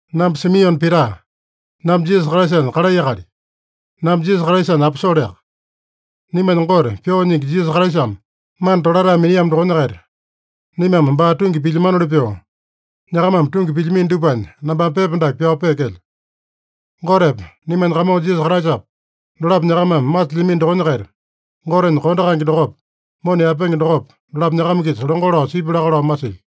Namba Simione Pita. Namba Jisasa Kraisanya kalai akali. Namba Jisasa Kraisanya aposoleaka. Naimanya Gote, Pyoo Nyingi Jisasa Kraisame mana tolatae miniamo dokonya-kaita, naimame baa tungi pilyamanoli pyoo, nyakamame tungi pilyamino dupanya nambame pepa dake pyao peekelyo. Gotepa, naimanya Kamongo Jisasa Kraisapa, dolapo nyakamame masilyamino dokonya-kaita, Gotenya kondo kaenge dokopa, mona yaepenge dokopa, dolapo nyakama-kisa longo lao sipya laka lao masilyo.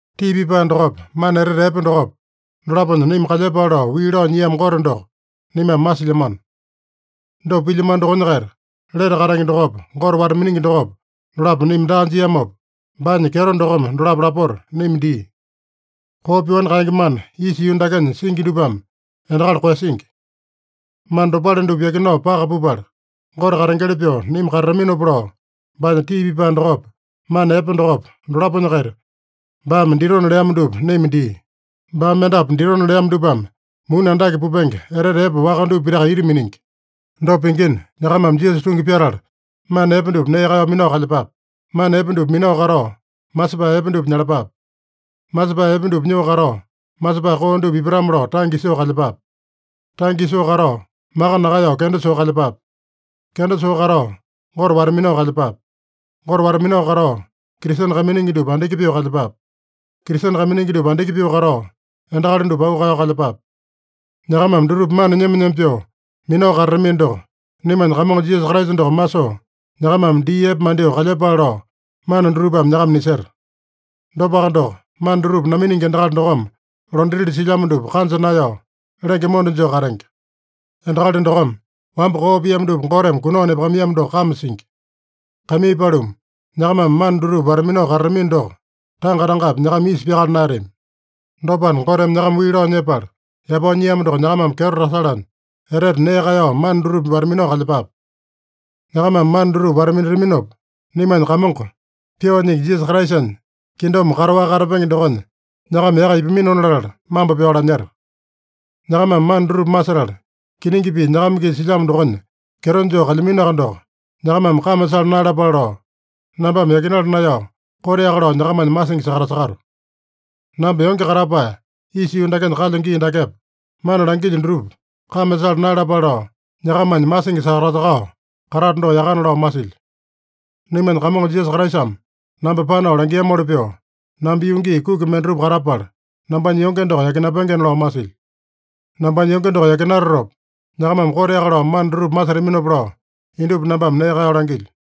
Tii pipae dokopa, mana etete epe dokopa, dolaponya naima kalyepale lao wii lao nyiamo Gote doko naimame masilyamano. Dopa pilyamano dokonya-kaita, lete katenge dokopa, Gote wata-miningi dokopa, dolapo naima daa jiamopa, baanya kyeto dokome dolapo lapota naima dia. Koo pyoani kaenge mana, isa yuu dakenya singi dupame endakali koeyasingi. Mana dopale dupa yakinao paka pupala, Gote katengeli pyoo naima katataminopa lao, baanya tii pipae dokopa, mana epe dokopa, dolaponya-kaita, baame ditona leamo dupa naima dia. Baame mendapu ditona leamo dupame muni andake pupenge, etete epe waka dupa pitaka ita miningi. Dopa pingina, nyakamame Jisasa tungi pyatala, mana epe dupa nee kaeyao minao kalyepape. Mana epe dupa minao katao, masepae epe dupa nyalapape. Masepae epe dupa nyoo katao, masepae koo dupa ipatame-lao tange isoo kalyepape. Tange isoo katao, maka nakaeyao kenda soo kalyepape. Kenda soo katao, Gote wata-minao kalyepape. Gote wata-minao katao, Kristene kaiminingi dupa andiki pyoo kalyepape. Kristene kaiminingi dupa andiki pyoo katao, endakali dupa auu kaeyao kalyepape. Nyakamame dutupa mana nyema-nyema pyoo minao katatamino doko, naimanya Kamongo Jisasa Kraisa doko masoo, nyakamame dii epe mandyoo kalyepale lao mana dutupame nyakama niseta. Dopaka doko, mana dutupa naminingi endakali dokome londatili silyamo dupa kanja naeyao, lenge monda joo katenge. Endakali dokome wamba koo piamo dupa Goteme kunao nepakamaiyamo doko kame singi. Kaimii paluma, nyakamame mana dutupa wata-minao katatamino doko, tanga-tangapi nyakama isa pyakala naeyatami. Dopana, Goteme nyakama wii lao nyepala yapao nyiamo doko nyakamame kyeto tasalanya, etete nee kaeyao mana dutupa wata-minao kalyepape. Nyakamame mana dutupa wata-minataminopa, naimanya Kamongo, Pyoo Nyingi Jisasa Kraisanya kingdom kataowaka katapenge dokonya nyakama yaka ipaminona latala, mambo pyao lanyeta. Nyakamame mana dutupa masetala, kiningi pii nyakama-kisa silyamo dokonya kyeto joo kalyaminoaka doko, nyakamame kame sala naeyalapale lao, nambame yakinala naeyao, koteaka lao nyakamanya masingi sakatasakato. Namba yonge katapae isa yuu dakenya kalyo gii dakepa, mana langilyo dutupa kame sala naeyalapale lao, nyakamanya masingi sakatasakao katato doko yakana lao masilyo. Naimanya Kamongo Jisasa Kraisame namba panao langiamoli pyoo, namba yuu gii kuki mendatupa katapala, nambanya yonge doko yakinapengena lao masilyo. Nambanya yonge doko yakinatatopa, nyakamame koteaka lao mana dutupa masetaminopa lao, indupa nambame nee kaeyao langilyo.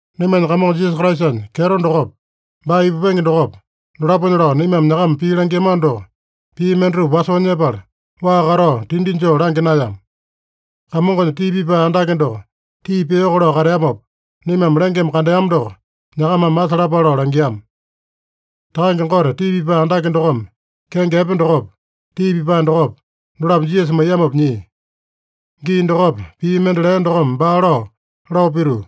Naimanya Kamongo Jisasa Kraisanya kyeto dokopa, baa ipupenge dokopa, dolaponya lao naimame nyakama pii langiamano doko, pii mendatupa wasoo nyepala, waa katao tindi joo langya naeyama. Kamongonya tii pipae andake doko tii piyoko lao kateamopa, naimame lengeme kandeama doko nyakamame masalapale lao langiama. Takange Gote Tii Pipae Andake dokome kenge epe dokopa, tii pipae dokopa, dolapo Jisasa maiyamopa nyia. Gii dokopa, pii mende lea dokome baa lao, lao pituu,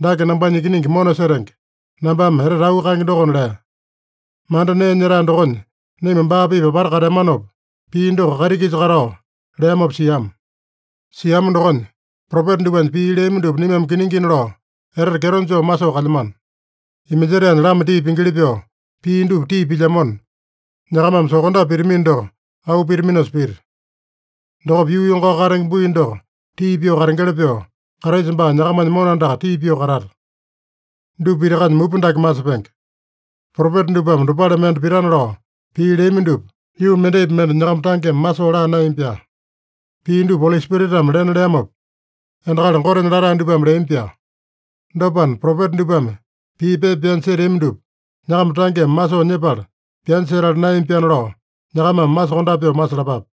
“Dake nambanya Ikiningi mona setenge, nambame etete auu kaenge dokona” lea. Manda nee nyetae dokonya naima baa-pipa apata kateamanopa, pii doko kaiti-kisa katao leamopa siama. Siama dokonya, propeta dupanya pii leami dupa naimame kiningina lao etete kyeto joo masoo kalyamano. Iminjetaenya lama tii pingili pyoo pii dupa tii pilyamona, nyakamame sokondape pitamino doko auu pitaminosa pita. Dokopa yuu yongao katenge bui doko tii pyoo katengeli pyoo, Kraisa baa nyakamanya mona andaka tii pyoo katata. Dupa pitakanya mupa dake masepenge: Propeta dupame dopale mende pitana lao pii leami dupa yuu mendaipi mende nyakama tangeme masoo laa naeyami-pyaa. Pii dupa Oli Spiritame lena leamopa, endakali Gotenya latae dupame leami-pyaa. Dopana, propeta dupame pii pepa pyanya seteami dupa, nyakama tangeme masoo nyepala pyanya setala naeyami-pyaana lao, nyakamame masokondape pyoo masalapape.